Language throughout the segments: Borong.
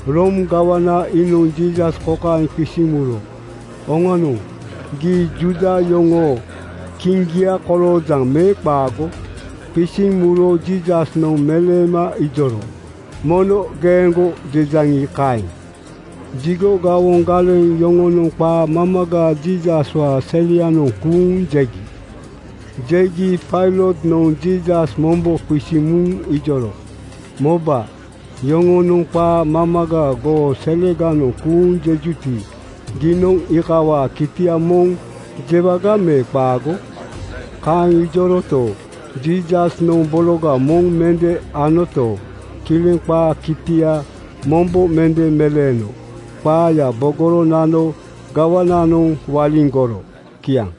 Room gawana iinoŋ Jiisas kokaeŋ qisiŋ muro, “Oŋanoŋ, gii Juuda yoŋoo kiŋgia koloojaŋ me qaago?” Qisiŋ muro Jiisasnoŋ meleema ijoro, “Mono geeŋgo jejaŋi, kaeŋ.” Jigo gawoŋ galeŋ yoŋonoŋ qaa mamaga Jiisaswaa selianoŋ kuuŋ jegi. Jegi Pailotnoŋ Jiisas mombo qisiŋ muŋ ijoro, “Moba! Yoŋonoŋ qaa mamaga goo seleganoŋ kuuŋ jejuti, giinoŋ iikawaa kitia moŋ jewaga me qaago?” Kaeŋ ijoroto, Jiisasnoŋ bologa moŋ mende anoto, kileŋ qaa kitia mombo mende meleeno. Qaaya bogoro nano gawananoŋ waliŋgoro. Kiaŋ.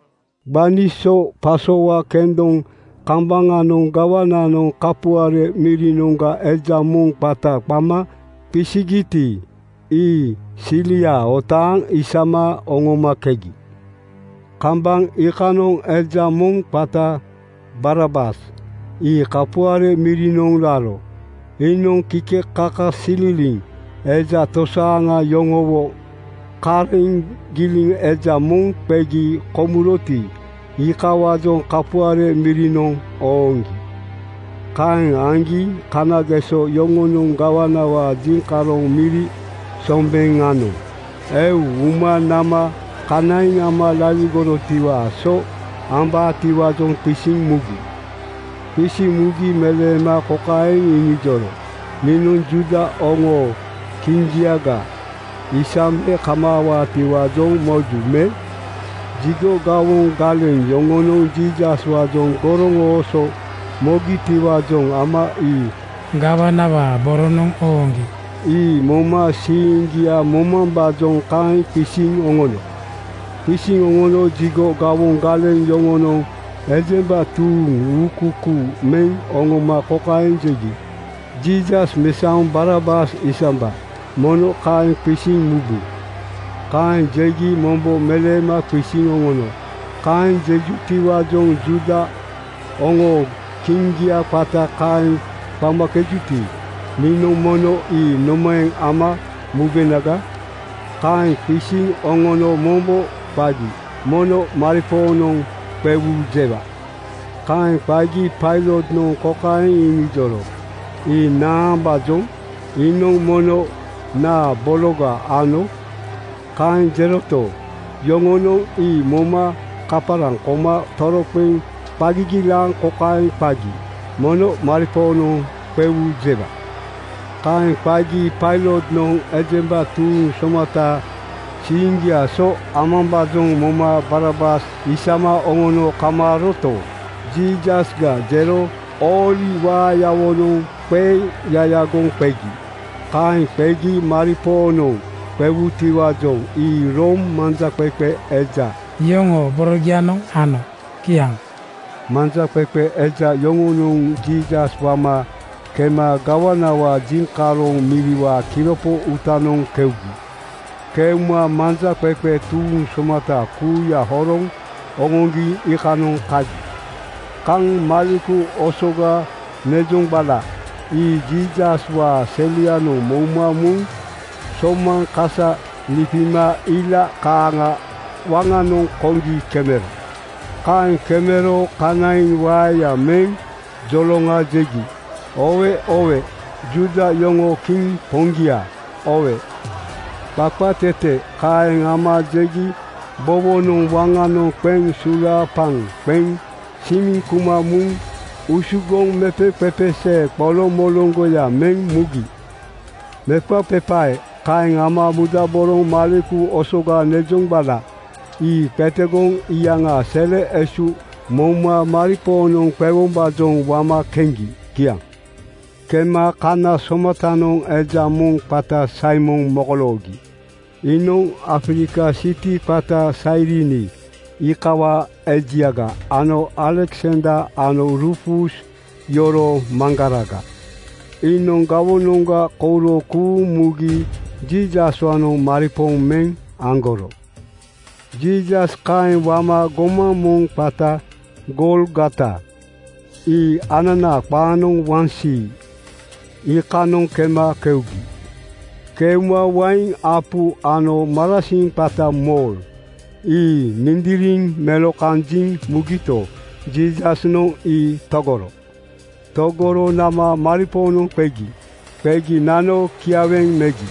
Gbani so pasowa kendoŋ kambaŋanoŋ gawananoŋ kapuare mirinoŋga eja moŋ qata qama qisigiti, ii silia otaaŋ isama oŋomakegi. Kambaŋ iikanoŋ eja moŋ qata Barabas ii kapuare mirinoŋ raro. Iinoŋ kikekakasililiŋ eja tosaaŋa yoŋowo kareŋ giliŋ eja moŋ qegi komuroti, iikawaajoŋ kapuare mirinoŋ oŋooŋgi. Kaeŋ aŋgi kanageso yoŋonoŋ gawanawaa jiŋkaroŋ miri sombeŋanoŋ eu uma nama kanaiŋ ama laligorotiwaa so ambaatiwaajoŋ qisiŋ mugi. Qisiŋ mugi meleema kokaeŋ iŋijoro, “Niinoŋ Juuda oŋoo kiŋgiaga isambe kamaawaatiwaajoŋ moju me?” Jigo gawoŋ galeŋ yoŋonoŋ Jiisaswaajoŋ goroŋooso mogitiwaajoŋ ama ii gawanawaa boronoŋ ooŋgi. Ii moma siiŋgia momambaajoŋ kaeŋ qisiŋ oŋono. Qisiŋ oŋono jigo gawoŋ galeŋ yoŋonoŋ ejemba tuuŋ uukuukuu meŋ oŋoma kokaeŋ jegi, “Jiisas mesaoŋ Barabas isamba! Mono kaeŋ qisiŋ mubu.” Kaeŋ jegi mombo meleema qisiŋ oŋono, “Kaeŋ jejutiwaajoŋ Juuda oŋoo kiŋgia qata kaeŋ qamakejuti, niinoŋ mono ii nomaeŋ ama mubenaga?” Kaeŋ qisiŋ oŋono mombo qagi, “Mono maripoonoŋ qewu jewa!” Kaeŋ qagi Pailotnoŋ kokaeŋ iŋijoro, “Ii naambaajoŋ? Iinoŋ mono naa bologa ano?” Kaeŋ jeroto, yoŋonoŋ ii moma kaparaŋ koma toroqeŋ qa gigilaaŋ kokaeŋ qagi, “Mono maripoonoŋ qewu jewa!” Kaeŋ qagi Pailotnoŋ ejemba tuuŋ somata siiŋgiaa so amambaajoŋ moma Barabas isama oŋono kamaaroto, Jiisasga jero ooli waayawonoŋ qeyayagoŋ qegi. Kaeŋ qegi maripoonoŋ qewutiwaajoŋ ii Room manjaqeqe eja yoŋoo borogianoŋ ano. Kiaŋ. Manjaqeqe eja yoŋonoŋ Jiisas wama kema gawanawaa jiŋkaroŋ miriwaa kiropo uutanoŋ keugi. Keuma manjaqeqe tuuŋ somata kuuya horoŋ oŋoŋgi iikanoŋ kagi. Kaŋ maleku osoga nezoŋgbala ii Jiisaswaa selianoŋ mouma muŋ somaŋ kasa lipima ila kaaŋa waŋanoŋ koŋgi kemero. Kaeŋ kemero kanaiŋ waeya meŋ joloŋa jegi, “Oowe oowe! Juuda yoŋoo kiŋ poŋgia, oowe!” Qaqatete kaeŋ ama jegi bowonoŋ waŋanoŋ qeŋ sulaapaŋ qeŋ simiŋ kuma muŋ usugoŋ mepeqepesee qoloŋmoloŋgoya meŋ mugi. Mepaqepae kaeŋ ama mudaboroŋ maleku osoga nezoŋgbala ii qetegoŋ iyaŋaa sele esu mouma muŋ maripoonoŋ qewombaajoŋ wama keŋgi. Kiaŋ. Kema kana somatanoŋ eja moŋ qata Saimon mokoloogi. Iinoŋ Afrika siti qata Sairini iikawaa ejiaga ano Aleksander ano Ruufus yoroo maŋgaraga. Iinoŋ gawonoŋga kouro kuuŋ mugi Jiisaswaanoŋ maripooŋ meŋ aŋgoro. Jiisas kaeŋ wama gomaŋ moŋ qata Golgota ii ananaa qaanoŋ Waŋsii, iikanoŋ kema keugi. Keuma wain apu ano marasiŋ qata mor ii mindiriŋ melokanjiŋ mugito, Jiisasnoŋ ii togoro. Togoro nama maripoonoŋ qegi. Qegi nano kiaweŋ megi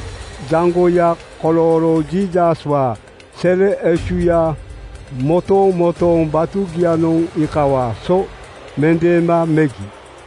jaŋgoya kolooro Jiisaswaa sele esuya motomotooŋ batugianoŋ iikawaa so mendeema megi.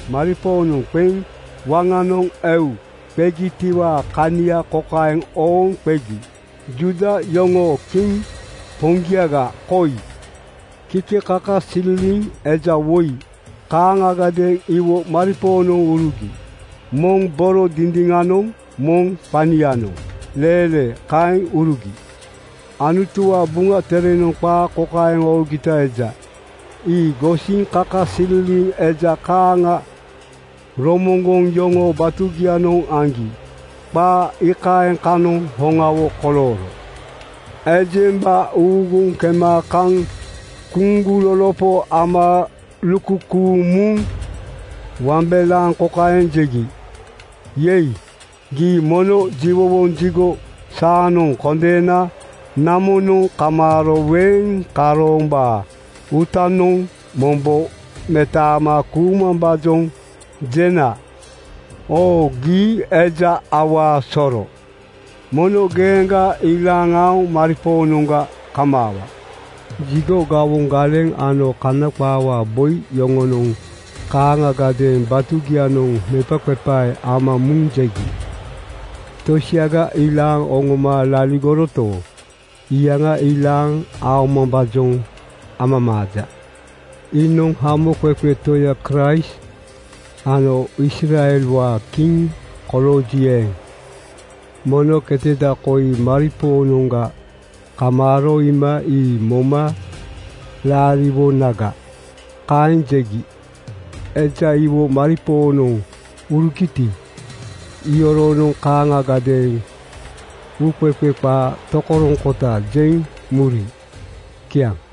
Maripoonoŋ qeŋ waŋanoŋ eu qegitiwaa kania kokaeŋ ooŋ qegi, “Juuda yoŋoo kiŋ poŋgiaga koi.” Kikekakasililiŋ eja woi kaaŋagadeeŋ iwo maripoonoŋ urugi. Moŋ boro dindiŋanoŋ moŋ qanianoŋ leelee kaeŋ urugi. (Anutuwaa Buŋa Terenoŋ qaa kokaeŋ oogita eja, “Ii gosiŋ kikekakasililiŋ eja kaaŋa romoŋgoŋ yoŋoo batugianoŋ aŋgi.” Qaa iikaeŋ kanoŋ hoŋawo kolooro.) Ejemba uuguŋ kema kaŋ kuŋgulolopo ama lukukuuŋ muŋ wambelaaŋ kokaeŋ jegi, “Yei! Gii mono jiwowoŋ jigo saanoŋ kondeena namonoŋ kamaaro weeŋ karoombaa uutanoŋ mombo metaama kuumambaajoŋ jena. Oo, gii eja awaa soro! Mono geeŋga ilaaŋ aoŋ maripoonoŋga kamaawa.” Jigo gawoŋ galeŋ ano Kana qaawaa boi yoŋonoŋ kaaŋagadeeŋ batugianoŋ mepaqepae ama muŋ jegi, “Tosiaga ilaaŋ oŋoma laligoroto, iyaŋa ilaaŋ aomambaajoŋ amamaaja. Iinoŋ Hamoqeqe Toya Kraist ano Israelwaa kiŋ kolooji eeŋ, mono keteda koi maripoonoŋga kamaaro iima ii moma laariwonaga.” Kaeŋ jegi. Eja iwo maripoonoŋ urugiti, iyoronoŋ kaaŋagadeeŋ uuqeqe qaa tokoroŋkota jeŋ muri. Kiaŋ.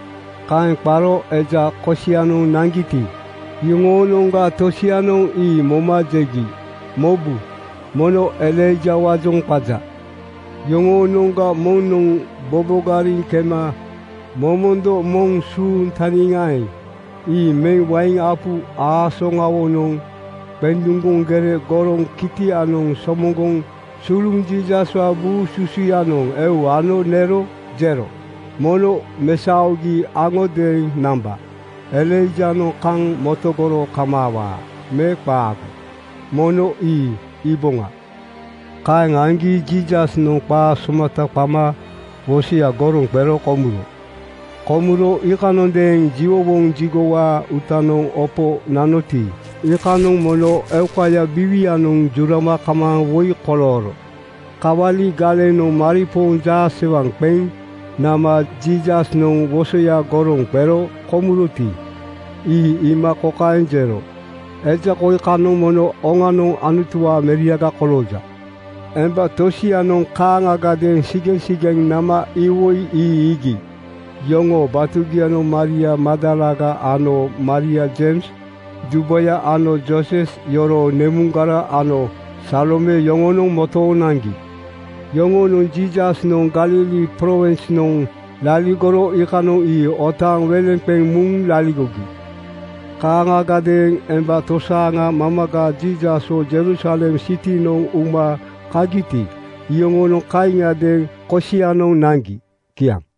Kaeŋ qaro eja kosianoŋ naŋgiti, iyoŋoonoŋga tosianoŋ ii moma jegi, “Mobu! Mono Elaijawaajoŋ qaja.” Yoŋoonoŋga moŋnoŋ bobogariŋ kema momondo moŋ suuŋ taniŋeeŋ ii meŋ wain apu aasoŋawonoŋ qenduŋgoŋ gere goroŋ kitianoŋ somoŋgoŋ suluŋ Jiisaswaa buu susuyanoŋ eu ano nero jero, “Mono mesaogi aŋodeeŋ namba. Elaijanoŋ kaŋ motogoro kamaawaa me qaago, mono ii iiboŋa.” Kaeŋ aŋgi Jiisasnoŋ qa somata qama wosoya goroŋ qero komuro. Komuro iikanondeeŋ jiwowoŋ jigowaa uutanoŋ opo nanoti, iikanoŋ mono eukaya biiwianoŋ jurama kamaaŋ woi kolooro. Kawali galenoŋ maripooŋ jaasewaŋ qeŋ nama Jiisasnoŋ wosoya goroŋ qero komuroti, ii iima kokaeŋ jero, “Eja koi kanoŋ mono oŋanoŋ Anutuwaa meriaga kolooja.” Emba tosianoŋ kaaŋagadeeŋ sigeŋsigeŋ nama iwoi ii iigi. Yoŋoo batugianoŋ Maria Magdalaga ano Maria Jeims dubaya ano Jooses yoroo nemuŋgara ano Salome yoŋonoŋ motooŋ naŋgi. Yoŋonoŋ Jiisasnoŋ Galili prowinsnoŋ laligoro iikanoŋ ii otaaŋ weleŋ qeŋ muŋ laligogi. Kaaŋagadeeŋ emba tosaaŋa mamaga Jiisaswo Jerusalem sitinoŋ uma kagiti, iyoŋonoŋ kaaŋiadeeŋ kosianoŋ naŋgi. Kiaŋ.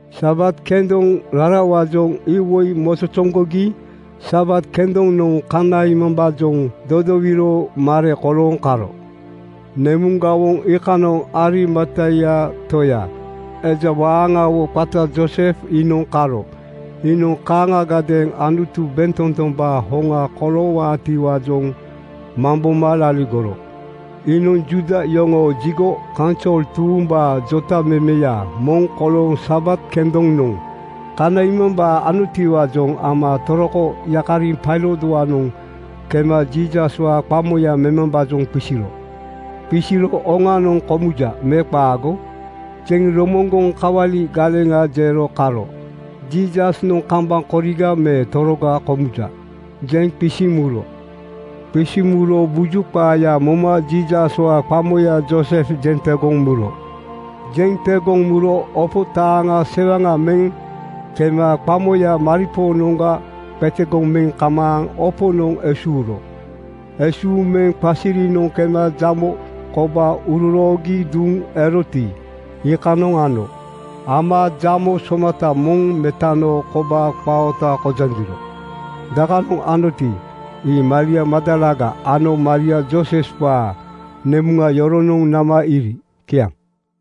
Sabat kendoŋ rarawaajoŋ iwoi mozozoŋgogi Sabat kendonoŋ kanaimambaajoŋ dodowiro mare kolooŋ karo. Nemuŋgawoŋ iikanoŋ Arimatia toya, eja waaŋawo qata Joosef iinoŋ karo. Iinoŋ kaaŋagadeeŋ Anutu bentotombaa hoŋa koloowaatiwaajoŋ mamboma laligoro. Iinoŋ Juuda yoŋoo jigo kaunsol tuumbaa jotamemeya moŋ kolooŋ Sabat kendonoŋ kanaimambaa anotiwaajoŋ ama toroko yakariŋ Pailotwaanoŋ kema Jiisaswaa qamoya memambaajoŋ qisiro. Qisiro “Oŋanoŋ komuja me qaago?” jeŋ romoŋgoŋ kawali galeŋa jero karo “Jiisasnoŋ kambaŋ koriga me toroga komuja,” jeŋ qisiŋ muro. Qisiŋ muro buju qaaya moma Jiisaswaa qamoya Joosef jeŋ tegoŋ muro. Jeŋ tegoŋ muro opo taaŋa sewaŋa meŋ kema qamoya maripoonoŋga qetegoŋ meŋ kamaaŋ oponoŋ esuuro. Esuuŋ meŋ qasirinoŋ kema jamo kobaa uroroogi duŋ eroti, iikanoŋ ano. Ama jamo somata moŋ metano kobaa qaa oota kojaŋgiro. Dakanoŋ anoti, ii Maria Magdalaga ano Maria Jooseswaa nemuŋa yoronoŋ nama iiri. Kiaŋ.